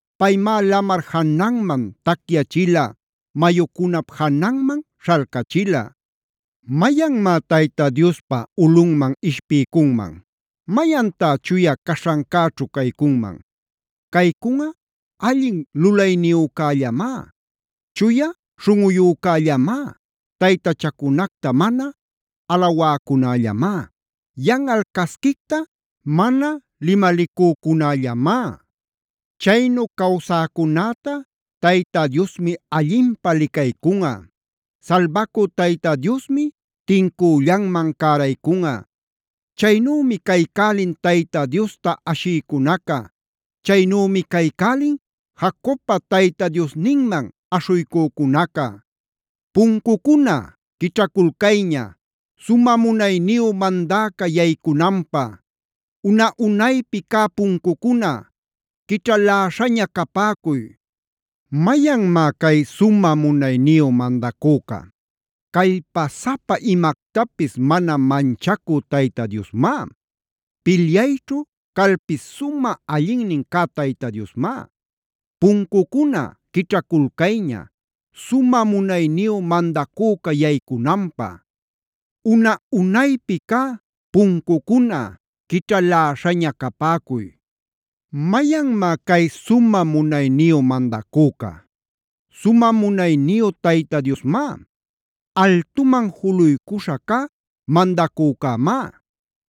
Paymá lamar jananman tacyachila. Mayucunap jananman śhalcachila. ¿Mayanmá Tayta Diospa ulꞌunman ishpiycunman? ¿Mayantá chuya caśhancäćhu caycunman? Caycunꞌa allin lulayniyücällamá,b chuya śhunꞌuyücällamá, taytachacunacta mana alawäcunällamá, yanꞌal casquicta mana limalicücunällamá. Chaynu cawsäcunäta Tayta Diosmi allinpä licaycunꞌa. Salbacü Tayta Diosmi tincüllanman cäraycunꞌa. Chaynümi caycälin Tayta Diosta ashïcunaca. Chaynümi caycälin Jacobpa Tayta Diosninman aśhuycücunaca. Selah. ¡Puncucuna quićhaculcayña, sumä munayniyu mandäca yaycunanpä! ¡Una-unaypi cä puncucuna quićhaläśhaña capäcuy! ¿Mayanmá cay sumä munayniyu mandacüca? Callpasapa imactapis mana manchacü Tayta Diosmá. Pilyayćhu calpis sumä allinnin cä Tayta Diosmá. ¡Puncucuna quićhaculcayña, sumä munayniyu mandacüca yaycunanpä! ¡Una-unaypi cä puncucuna quićhaläśhaña capäcuy! ¿Mayanmá cay sumä munayniyu mandacüca? Sumä munayniyu Tayta Diosmá. Altuman juluycuśha cä mandacücämá. Selah.